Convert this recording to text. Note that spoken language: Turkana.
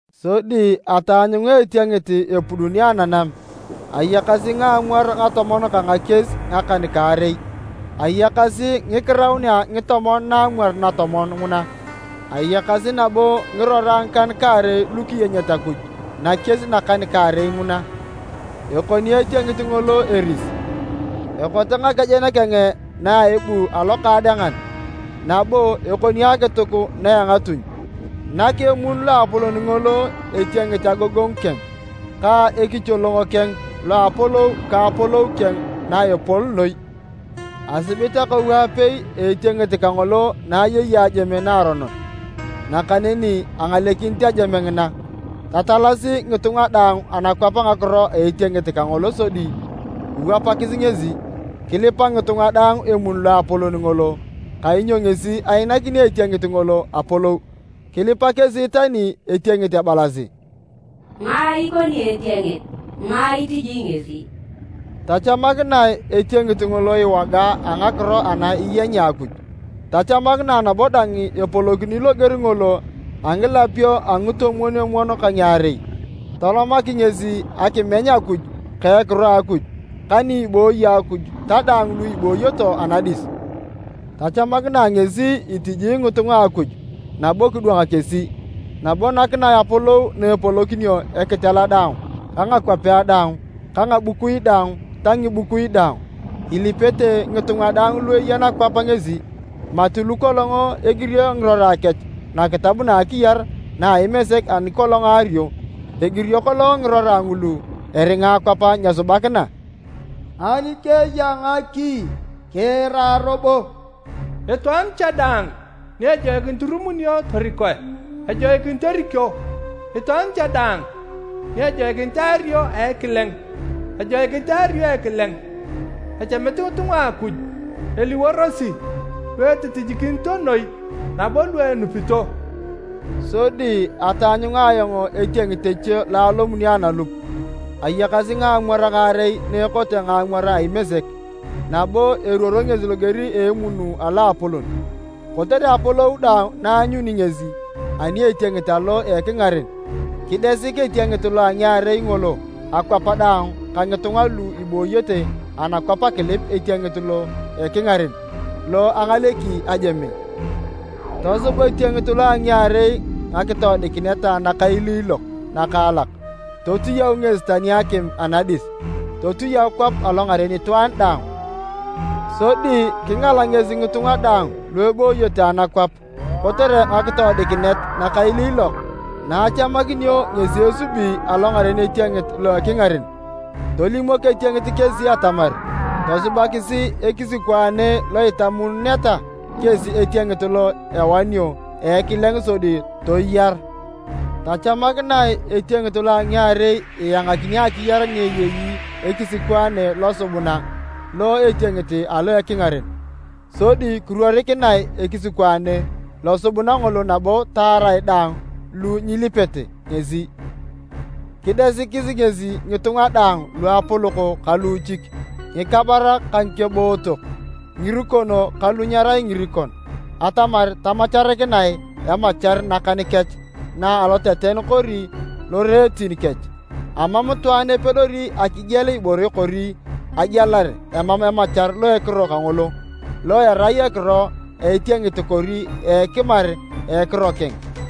Sodi ataanyunga etiengit epuduni ananam. Ayakasi ngaamwar ngatomon ka ngakies ngakan-kaarei, ayakasi ngikiraunea ngitomon naamwar natomon nguna. Ayakasi nabo ngirora ngikan-kaarei lu kiyenyet Akuj nakies nakan-kaarei nguna. Ekoni etiengit ngolo eris, ekote ngakejen keng na a ebu alokaadengan, nabo ekoni akituk na a engatuny. Nak emun loapolon ngolo etiengit agogongu keng ka ekicholong keng lo a apolou ka apolou keng na epol noi. Asibit akou apei a etiengit kangolo na ayei ajeme naaronon, nakaneni angalekinit ajeme ngina. Tatalasi ngitunga daang anakwap ngakiro a etiengit kangolo sodi kiwapakis ngesi. Kilipa ngitunga daang emun loapolon ngolo kainyo ngesi ainakini etiengit ngolo apolou. Kilipa kesi tani etiengit ebalasi, “Ngae ikoni etiengit? Ngae itiji ngesi?” Tachamakinae etiengit ngolo iwoga a ngakiro ana iyenyea Akuj, tachamakinae nabo dang epolokini loger ngolo a ngilapio a ngitomwon-omwon ka ngiarei. Tolomak ngesi akimeny Akuj ka ekiro a Akuj, ka ni ibooyo Akuj ta daang lu ibooyete anadis. Tachamakinae ngesi itiji ngitunga a Akuj nabo kidwang kesi, nabo nakinae apolou na epolokinio ekitela daang ka ngakwapea daang ka ngabukui daang ta ngibukui daang. Ilipete ngitunga daang lu eya nakwap ngesi, mati lu kolong egirio ngirora kech nakitab na a akiyar na a Imesek ani kolong aario. Egirio kolong ngirora ngulu eringa akwap nyesubakina. “Ani keya ngaki, kiira robo! Itwaan cha daang ni ejoikinit irumunio torikoe, ejoikinit erikio, itwaan cha daang ni ejoikinit eario a ekileng, ejoikinit eario a ekileng. Echamit ngitunga lu a Akuj eliworosi lu etitinyikinito noi nabo lu enupito.” Sodi ataanyunga ayong etiengit eche lo alomuni analup. Ayakasi ngaamwar ngaarei na ekote ngaamwar a imesek, nabo eruoro ngesi loger a emun aloapolon. Kotere apolou daang na aanyuni ngesi ani a etiengit alo ekingaren, kidesik etiengit lo a ngiarei ngolo akwap daang ka ngitunga lu ibooyete anakwap akilip etiengit lo ekingaren, lo angaleki ajeme. Tosub etiengit lo a ngiarei ngakitoodikinet nakailiilok nakaalak, totiyau ngesi tani akim anadis totiyau kwap alongaren itwaan daang. Sodi kingala ngesi ngitunga daang lu ebooyete anakwap kotere ngakitoodikinet nakailiilok na achamakinio ngesi esubi alongaren etiengit lo a ekingaren. Tolimok etiengit kesi atamar tosubakis ekisikwaane lo itamununeta kesi etiengit lo awanio a ekileng sodi toyar. Tachamakinae etiengit lo a ngiarei iangakini akiyar ni eyei ekisikwaane losubuna lo a etiengit alo a ekingaren, sodi kiruorikinea ekisikwaane losubuna ngolo nabo taar daang lu nyilipete ngesi. Kidesik ngesi ngitunga daang, luapolok ka luuchik, ngikabarak ka ngikebootok, ngirikon ka lu nyerai ngirikon, atamar tamacharikinae emachar nakan kech na aloteten kori loreetin kech. Amam itwaan epedori akigiel ibore kori agielar emam emachar lo ekiro kangolo, lo erai ekiro a etiengit kori ekimar a ekiro keng.